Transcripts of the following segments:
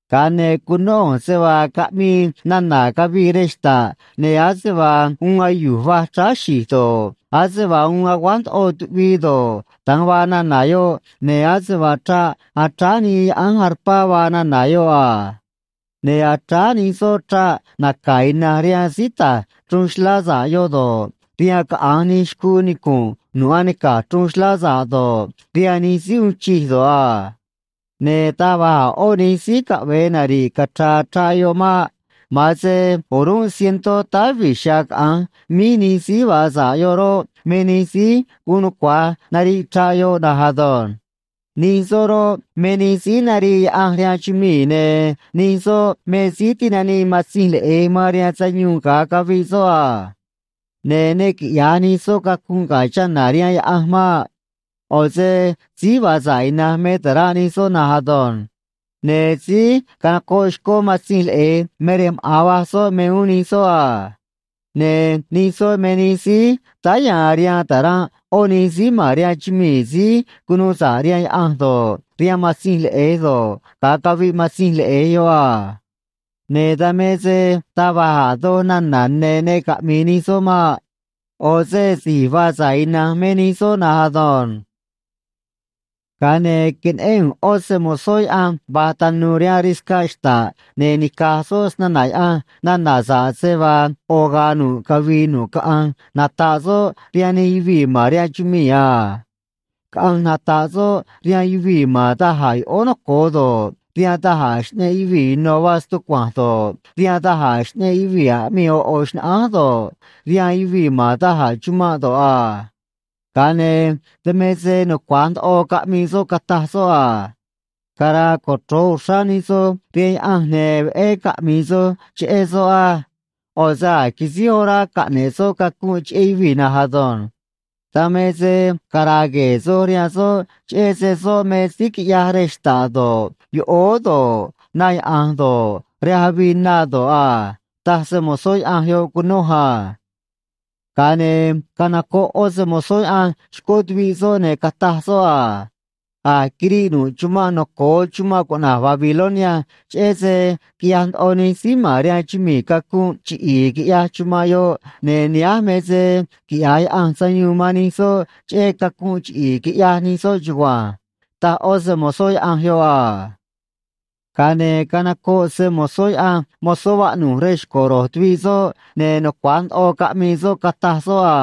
Ga̱a ne̱ cunó ꞌu̱nj se vaa caꞌmii nana̱ cavii rej xta̱ꞌ, ne̱ ase vaa uun ayu̱j va̱j chráá xi̱j do̱ꞌ, ase vaa uun aguáj ndoꞌo tuꞌvii do̱ꞌ, da̱nj vaa nana̱ yoꞌ, ne̱ ase vaa chraꞌ achráá nii yaꞌánj arpá vaa nana̱ yoꞌ a. Ne̱ achráá nij soꞌ chraꞌ naca̱ ina̱nj rihaan síí ta̱j chruun xlá sa̱ꞌ yoꞌ do̱ꞌ, rihaan caꞌa̱nj nij xcuu nicu̱nꞌ nu̱ꞌ anica̱j chruun xlá sa̱ꞌ do̱ꞌ, rihaan nij síí uun chij do̱ꞌ a. Ne̱ taj va̱j a̱ ꞌó nij síí caꞌve̱e nari̱ꞌ cachra̱a̱ chraꞌ yoꞌ maꞌ. Ma̱an se o̱rúnꞌ cientó táá vi̱j chiha̱a̱ caꞌa̱nj míj nij síí vaa sa̱ꞌ yoꞌ roꞌ, me nij síí guun nucua̱j nariꞌ chraꞌ yoꞌ na̱nj ado̱nj. Nij soꞌ roꞌ, me nij síí narii Yaꞌanj rihaan chumii̱, ne̱ nij soꞌ me síí tinanii Matzinj Leꞌe̱j man rihaan sayuun ga̱a caviꞌ soꞌ a. Ne̱ ne quiꞌya̱j nij soꞌ cacunꞌ ga̱ chana̱ rihaan Yaꞌanj maꞌ. ꞌO̱ se síí vaa sa̱ꞌ ina̱nj me ta̱ranꞌ nij soꞌ na̱nj ado̱nj. Ne̱ síí canocoꞌ xcó Matzinj Leꞌe̱j me rej maꞌa̱n va̱j soꞌ me uún nij soꞌ a. Ne̱ nij soꞌ me nij síí táá ya̱a̱n rihaan ta̱ranꞌ ꞌó nij síí ma̱n rihaan chumii̱ síí cunuu sa̱ꞌ rihaan Yaꞌanj do̱ꞌ, rihaan Matzinj Leꞌe̱j do̱ꞌ, ga̱a caviꞌ Matzinj Leꞌe̱j yoꞌ a. Ne̱ dan me se taj va̱j a̱ doj nana̱ ne̱ ne caꞌmi̱i̱ nij soꞌ maꞌ. ꞌO̱ se si̱j vaa sa̱ꞌ ina̱nj me nij soꞌ na̱nj ado̱nj. Ga̱a ne̱ queneꞌén ꞌu̱nj ꞌó se‑mo̱zó Yaꞌanj va̱j tanu̱u̱ rihaan riscaꞌ xta̱ꞌ, ne̱ nica̱j soꞌ snana̱ Yaꞌanj nana̱ sa̱ꞌ se vaa ꞌo̱ ga̱a̱ nu̱ꞌ cavii nu̱ꞌ caꞌanj nata̱ꞌ soꞌ rihaan nij yuvii̱ man rihaan chumii̱ a. Caꞌanj nata̱ꞌ soꞌ rihaan yuvii̱ ma̱n da̱j a̱ yoꞌóó noco̱o do̱ꞌ, rihaan da̱j a̱ xꞌneꞌ yuvii̱ ino̱ vaa stucua̱nj do̱ꞌ, rihaan da̱j a̱ xꞌneꞌ yuvii̱ aꞌmii ꞌo̱ ꞌo̱ xnaꞌánj do̱ꞌ, rihaan yuvii̱ ma̱n da̱j a̱ chumanꞌ do̱ꞌ a. Ga̱a ne̱ dan me se nucua̱j ndoꞌo caꞌmii soꞌ, cataj soꞌ a: ―Cara̱a̱ cochro̱j uxrá nij soj rihaan Yaꞌanj, ne̱ veꞌé caꞌmi̱i̱ soj cheꞌé soꞌ á. ꞌO̱ se a̱j quisíj orá caꞌne̱ꞌ soꞌ cacunꞌ cheꞌé yuvii̱ na̱nj ado̱nj. Dan me se cara̱a̱ gue̱e̱ soj rihaan soꞌ, cheꞌé se soꞌ me síí quiꞌyaj rej xta̱ꞌ do̱ꞌ, yoꞌóó do̱ꞌ, na yaꞌa̱nj do̱ꞌ, rej avii na do̱ꞌ a ―taj se‑mo̱zó Yaꞌanj yoꞌ cunoj a. Ga̱a ne̱ canocoꞌ ꞌó se‑mo̱zó Yaꞌanj xcó tuviꞌ soꞌ, ne̱ cataj soꞌ a: ―A̱j quiriꞌ nu̱ꞌ chumanꞌ noco̱o chumanꞌ cuꞌna̱j Babilonia, cheꞌé se quiꞌyaj ndoꞌo nij síí ma̱n rihaan chumii̱ cacunꞌ chiꞌi̱i̱, quiꞌyaj chumanꞌ yoꞌ, ne̱ nihánj me se quiꞌya̱j Yaꞌanj sayuun man nij soꞌ cheꞌé cacunꞌ chiꞌi̱i̱ quiꞌyaj nij soꞌ chugua̱nj ―taj ꞌó se‑mo̱zó Yaꞌanj yoꞌ a. Ga̱a ne̱ canocoꞌ se‑mo̱zó Yaꞌanj mozó vaꞌnu̱j rej xco̱ ro̱j tuviꞌ soꞌ, ne̱ nucua̱j ndoꞌo caꞌmii soꞌ, cataj soꞌ a: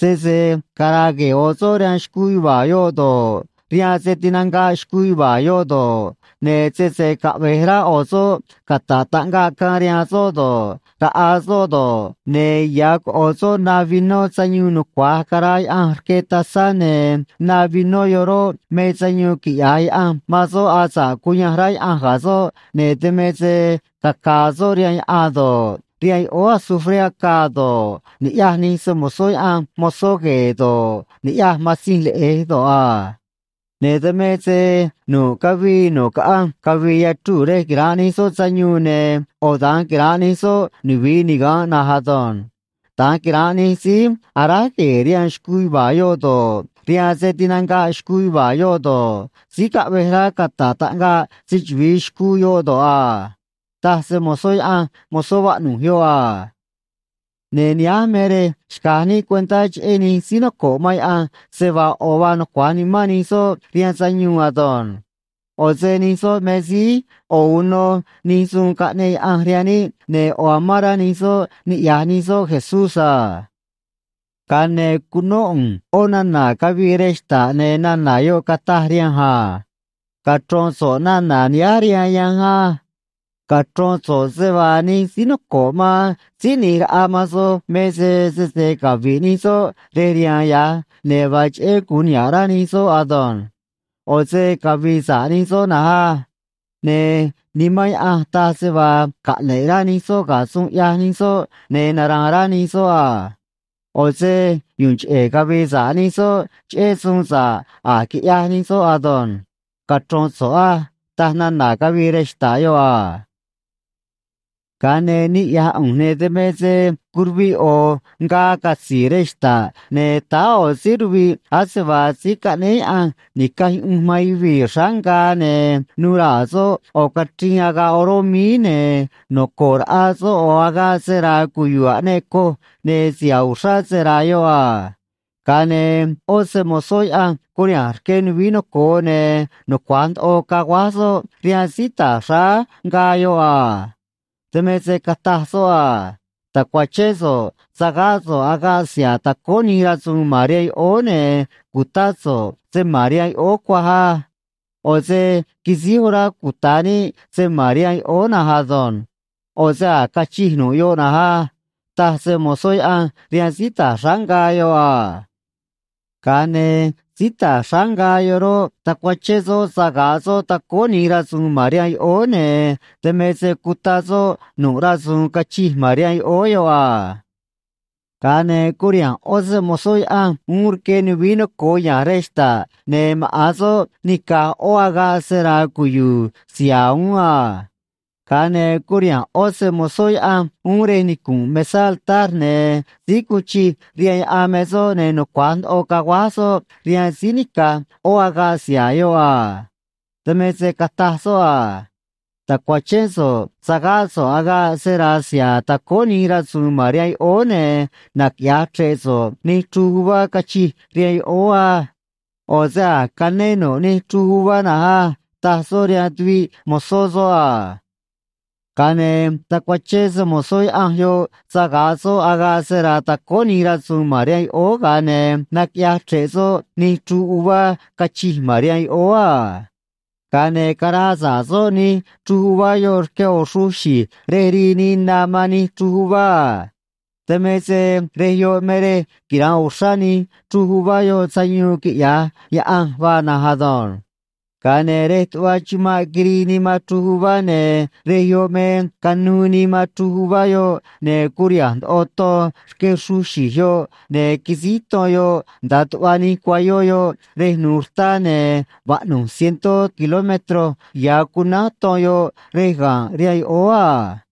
―Sese cara̱a̱ gue̱e̱ ꞌo̱ soꞌ rihaan xcuu yuva̱a̱ yoꞌ do̱ꞌ, rihaan se tinanga̱ꞌ xcuu yuva̱a̱ yoꞌ do̱ꞌ, ne̱ sese caꞌve̱j rá ꞌo̱ soꞌ cata̱ꞌ taꞌngaꞌ caan rihaan soꞌ do̱ꞌ, raꞌa soꞌ do̱ꞌ, ne̱ ya̱ coꞌo̱ soꞌ na vinó sayuun nucua̱j caraa Yaꞌanj rque tazá, ne̱ na vinó yoꞌ roꞌ, me sayuun quiꞌya̱j Yaꞌanj man soꞌ asa̱ꞌ cuyanj rá Yaꞌanj ga̱ soꞌ, ne̱ dan me se caca̱a̱ soꞌ rihaan yaꞌan do̱ꞌ, rihaan yoꞌóó azufré acaa do̱ꞌ, ni̱ꞌyaj nij se‑mo̱zó Yaꞌanj mozó gue̱e̱ do̱ꞌ, ni̱ꞌyaj Matzinj Leꞌe̱j do̱ꞌ a. Ne̱ dan me se nu̱ꞌ cavii nu̱ꞌ caꞌanj cavi̱i̱ yachruu̱ rej quira̱nꞌ nij soꞌ sayuun, ne̱ ꞌo̱ da̱nj quira̱nꞌ nij soꞌ nuvi̱i niga̱nꞌ na̱nj ado̱nj. Da̱nj quira̱nꞌ nij síí aráj gue̱e̱ rihaan xcuu yuva̱a̱ yoꞌ do̱ꞌ, rihaan se tinanga̱ꞌ xcuu yuva̱a̱ yoꞌ do̱ꞌ, síí caꞌvej rá cataꞌ taꞌngaꞌ se‑chuvi̱i xcuu yoꞌ do̱ꞌ a ―taj se‑mo̱zó Yaꞌanj mozó vaꞌnu̱j yoꞌ a. Ne̱ nihánj me rej xca̱j níꞌ cuentá cheꞌé nij síí noco̱ꞌ man Yaꞌanj, se vaa ꞌo̱ vaa nucua̱j nimán nij soꞌ rihaan sayuun ado̱nj. ꞌO̱ se nij soꞌ me síí ꞌo̱ uno nij suun caꞌneꞌ Yaꞌanj rihaan níꞌ, ne̱ ꞌo̱ amán rá nij soꞌ niꞌya̱j nij soꞌ Jesús a. Ga̱a ne̱ cunó ꞌu̱nj ꞌó nana̱ cavii rej xta̱ꞌ, ne̱ nana̱ yoꞌ cataj rihanj a: ―Cachro̱n so̱ꞌ nana̱ nihánj rihaan yanj á. Cachro̱n so̱ꞌ se vaa nij síí noco̱ꞌ man Síí ꞌNi̱j Raꞌa man soj me se sese cavi̱ꞌ nij soꞌ rej rihaan ya̱j, ne̱ vaa cheꞌé gu̱un niha̱ꞌ rá nij soꞌ ado̱nj. ꞌO̱ se cavi̱i̱ sa̱ꞌ nij soꞌ na̱nj á. Ne̱ Nimán Yaꞌanj taj se vaa caꞌne̱ꞌ rá nij soꞌ ga̱ suun ꞌyaj nij soꞌ, ne̱ nara̱a̱n rá nij soꞌ a. ꞌO̱ se yu̱u̱n cheꞌe̱ cavi̱i̱ sa̱ꞌ nij soꞌ cheꞌé suun sa̱ꞌ a̱j quiꞌyaj nij soꞌ ado̱nj, cachro̱n so̱ꞌ á ―taj nana̱ cavii rej xta̱ꞌ yoꞌ a. Ga̱a ne̱ niꞌya̱j ꞌu̱nj, ne̱ dan me se curuviꞌ ꞌo̱ ngaa catzi̱i̱ rej xta̱ꞌ, ne̱ táá ꞌo̱ síí ruviꞌ ase vaa Síí Caꞌnéé Yaꞌanj Ni̱caj Yuꞌunj man Yuvii̱ xráá ngaa, ne̱ nu̱u̱ raa̱ soꞌ ꞌo̱ cachriin agaꞌ oró míí, ne̱ noco̱ꞌ raꞌa soꞌ ꞌo̱ agaꞌ sera̱a̱ cuyu̱u̱ aꞌneꞌ coj, ne̱ siha̱a̱ uxrá sera̱a̱ yoꞌ a. Ga̱a ne̱ ꞌó se‑mo̱zó Yaꞌanj curiha̱nj rque nuvií noco̱o, ne̱ nucua̱j ndoꞌo caguáj soꞌ rihaan síí ta̱j xráá ngaa yoꞌ a. Dan me se cataj soꞌ a: ―Ta̱cuachén so̱ꞌ sa̱gáꞌ so̱ꞌ agaꞌ siha̱a̱ tacóó nij rasu̱u̱n ma̱n rihaan yoꞌóó, ne̱ cu̱tá so̱ꞌ se ma̱n rihaan yoꞌóó cuaj á. ꞌO̱ se quisíj orá cuta̱ níꞌ se ma̱n rihaan yoꞌóó na̱nj ado̱nj. ꞌO̱ se a̱j cachij nu̱ꞌ yoꞌ na̱nj á ―taj se‑mo̱zó Yaꞌanj rihaan síí ta̱j xráá ngaa yoꞌ a. Ga̱a ne̱ síí ta̱j xráá ngaa yoꞌ roꞌ, tacuachén soꞌ saga̱ꞌ soꞌ tacóó nij rasu̱u̱n ma̱n rihaan yoꞌóó, ne̱ dan me se cuta soꞌ nu̱ꞌ rasu̱u̱n cachij ma̱n rihaan yoꞌóó yoꞌ a. Ga̱a ne̱ curiha̱nj ꞌó se‑mo̱zó Yaꞌanj uún rque nuvií noco̱o ya̱nj rej xta̱ꞌ, ne̱ maꞌa̱n soꞌ nica̱j ꞌó agaꞌ sera̱a̱ cuyu̱u̱ siha̱a̱ uún a. Ga̱a ne̱ curiha̱nj ꞌó se‑mo̱zó Yaꞌanj uún rej nicu̱nꞌ mesá altar, ne̱ síí guun chij rihaan yaꞌan me soꞌ, ne̱ nucua̱j ndoꞌo caguáj soꞌ rihaan síí nica̱j ꞌó agaꞌ siha̱a̱ yoꞌ a. Dan me se cataj soꞌ a: ―Ta̱cuachén so̱ꞌ sa̱gáꞌ so̱ꞌ agaꞌ sera̱a̱ siha̱a̱ tacóó nij rasu̱u̱n ma̱n rihaan yoꞌóó, ne̱ naquiꞌya̱j chre̱ꞌ so̱ꞌ nij chruj uvá cachij rihaan yoꞌóó á. ꞌO̱ se a̱j cané nu̱ꞌ nij chruj uvá na̱nj á ―taj soꞌ rihaan tuviꞌ mo̱zó soꞌ a. Ga̱a ne̱ tacuachén se‑mo̱zó Yaꞌanj yoꞌ saga̱ꞌ soꞌ agaꞌ sera̱a̱ tacóó nij rasu̱u̱n ma̱n rihaan yoꞌóó, ga̱a ne̱ naquiꞌyaj chre̱ꞌ soꞌ nij chruj uvá cachij ma̱n rihaan yoꞌóó a. Ga̱a ne̱ caraa sa̱ꞌ soꞌ nij chruj uvá yoꞌ rque ꞌo̱ xruj xi̱j rej rii nii na man nij chruj uvá a. Dan me se rej yoꞌ me rej quira̱nꞌ uxrá nij chruj uvá yoꞌ sayuun quiꞌya̱j Yaꞌanj vaa na̱nj ado̱nj. Ga̱a ne̱ rej tuꞌva chumanꞌ quirii nii man chruj uvá, ne̱ rej yoꞌ me canuu nii man chruj uvá yoꞌ, ne̱ curiha̱nj ndoꞌo ton rque xruj xi̱j yoꞌ, ne̱ quisíj ton yoꞌ nda̱a tuꞌva nij cuayó yoꞌ rej nu̱u̱ rtá, ne̱ vaꞌnu̱j cientó kilómetro ya̱ cunánj ton yoꞌ rej ga̱nꞌ rihaan yoꞌóó a.